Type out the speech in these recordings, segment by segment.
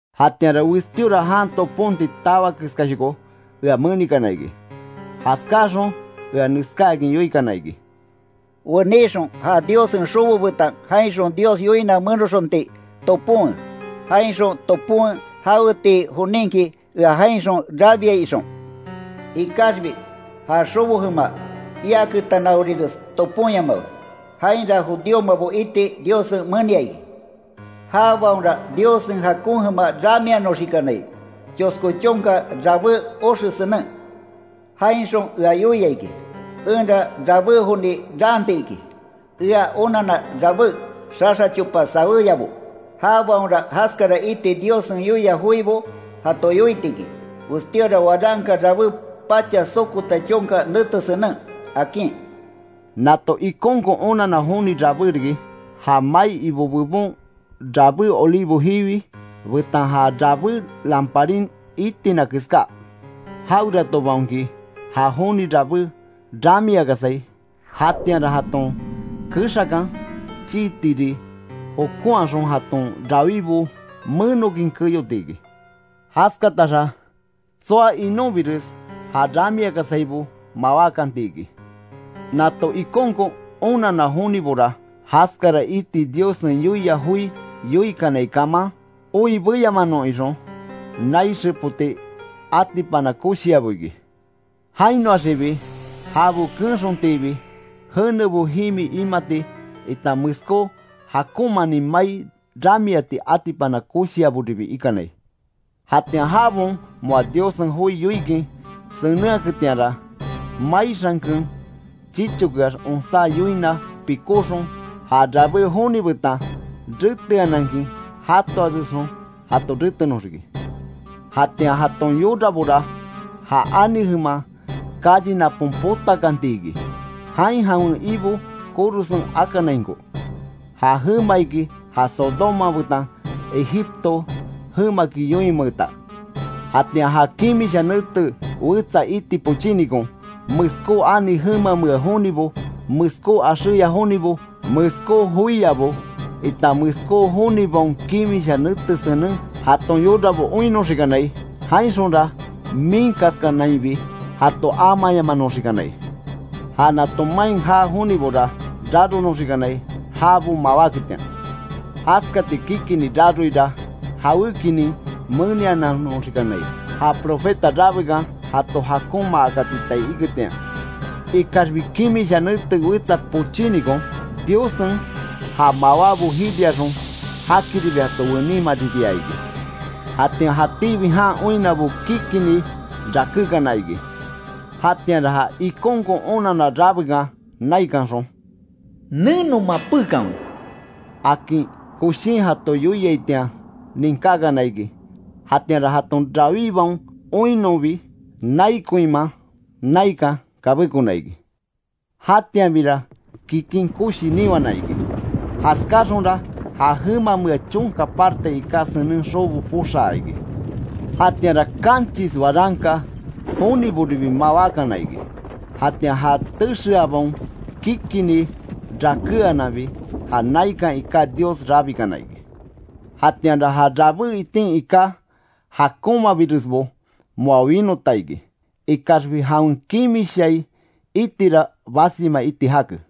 Jatianra westíora jan toponti tawa keskáshoko ea menikana iki; jaskáxon ea neskáakin yoikana iki: “Wenixon ja Diossen xobo betan jainxon Dios yoina menoxonti toponwe, jainxon toponwe, jawetii joninki ea jainxon rabiai ixon. Ikaxbi ja xobo jema iaketanaorires toponyamawe. Jainra judíomabo iti Diossen menia iki. Jabaonra Diossen jakon jema ramianoxikanai, chosko chonka rabé oxe senen. Jainxon ea yoia iki, enra rabé joni raanti iki; ea onanna rabé xaxa chopa saweyabo. Jabaonra jaskara iti Diossen yoia joibo jato yoiti iki; westíora waranka rabé pacha sokota chonka nete senen”, akin. Nato ikonkon onanna joni rabé riki, ja mai Ibo bebon rabé olivo jiwi, betan ja rabé lamparin itina keská. Jaweratobaonki ja joni rabé ramiakasai, jatianra jaton kexakan chii tiri jokonhaxon jaton rawibo menokin keyoti iki. Jaskataxa tsoa inonbires, já ramiakasaibo mawákanti iki. Nato ikonkon onanna jonibora, jaskara iti Diossen yoia joi yoikanai kaman, oi beyamanon ixon nai xepoti atipana koshiabo iki. Jainoaxibi jabo keenxontiibi, jenebo jimi imati, itan meskó jakonmanin mai ramiati atipana koshiaboribi ikanai. Jatian jabaon moa Diossen joi yoikin senenhaketianra, mai xanken chichokeax onsá yoina pikóxon, ja rabé joni betan reteanankin jatoaresxon jato retenoxiki. Jatian jaton yorabora ja ani jeman calle napon potakanti iki, jain jawen Ibo korosen akániainko. Ja jema iki ja Sodoma betan Egipto jemaki yoinmeeta. Jatian ja kimisha nete wetsa iti pochínikon, meskó ani jemamea jonibo, meskó axéya jonibo, meskó joiabo, itan meskó jonibaon kimisha nete senen jaton yorabo oinnoxikanai. Jainxonra miinkaskanainbi jato amayamanoxikanai. Ja nato main jaa jonibora raronoxikanai jabo mawáketian. Jaskati kikini raroira jawékinin meniananoxikanai, ja profeta rabekan jato jakonmaakatitai iketian. Ikaxbi kimisha nete wetsa pochínikon Diossen ja mawábo jiriaxon, jakiribi jato wenimaribia iki. Jatian jatíbi jan oinnabo kikini rakékana iki. Jatianra ja ikonkon onanna rabékan naikanxon “¡Neno mapékanwe!” akin koshin jato yoiaitian ninkákana iki. Jatianra jaton rawíbaon oinnonbi nai koinman naikan kabékona iki. Jatianbira kikin koshi niwana iki. Jaskáxonra ja jemamea chonka parte iká senen xobo poxaa iki. Jatianra kanchis waranka joniboribi mawákana iki. Jatian ja texeabaon kikini rakeananbi, ja naikan iká Dios rabikana iki. Jatianra ja rabé itin iká jakonmabiresbo moa winota iki; ikaxbi jawen kimishai itira basima iti jake.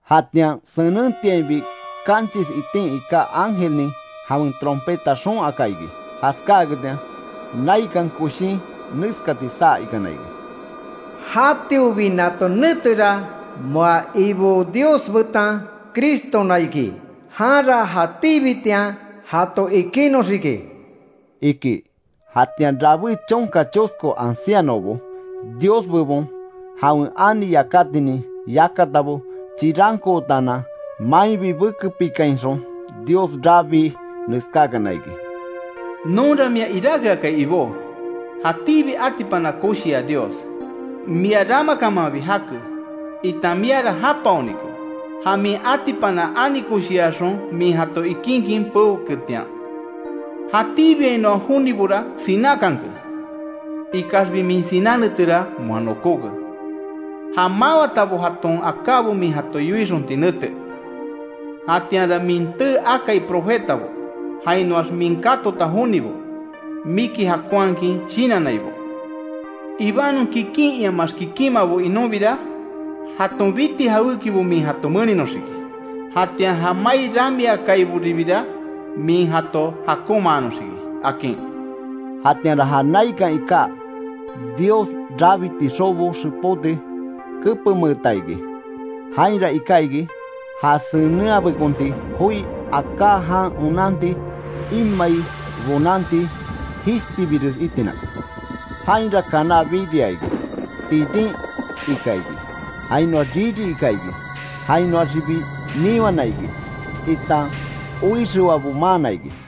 Jatian senentiainbi kanchis itin iká ángelnin jawen trompeta xoon aka iki. Jaskáaketian, naikan koshin neskati saa ikana iki: “Jatiobi nato netera, moa Ibo Dios betan Cristona iki. Janra jatíbitian jato ikinoxiki”, iki. Jatian rabé chonka chosko ancianobo, Dios bebon jawen ani yakatinin yakatabo chirankootaanan, mainbi bekepikainxon Dios rabii, neskákana iki: “Nonra mia iráke akai Ibó, jatíbi atipana koshia Dios. Mia ramakamanbi jake, itan miara japaonike, ja min atipana ani koshiaxon min jato ikinkin peoketian. Jatíbiainoa jonibora sinákanke, ikaxbi min siná netera moa nokóke, ja mawatabo jaton akábo min jato yoixonti nete. Jatianra min tee akai profetabo, jainoax min katota jonibo, miki jakonhakin shinannaibo; ibanon kikin iamaax kikinmabo inonbira, jaton biti jawékibo min jato meninoxiki. Jatian ja mai ramiakaiboribira, min jato jakonmanoxiki”, akin. Jatianra ja naikan iká Dios rabiti xobo xepoti, kepenmeeta iki. Jainra iká iki, ja senenhabekonti joi aká jan onanti imai bonanti jishtibires itina. Jainra kaná biria iki, tirin ika iki, jainoax riri ika iki. Jainoaxibi niwana iki, itan oixewabo maana iki.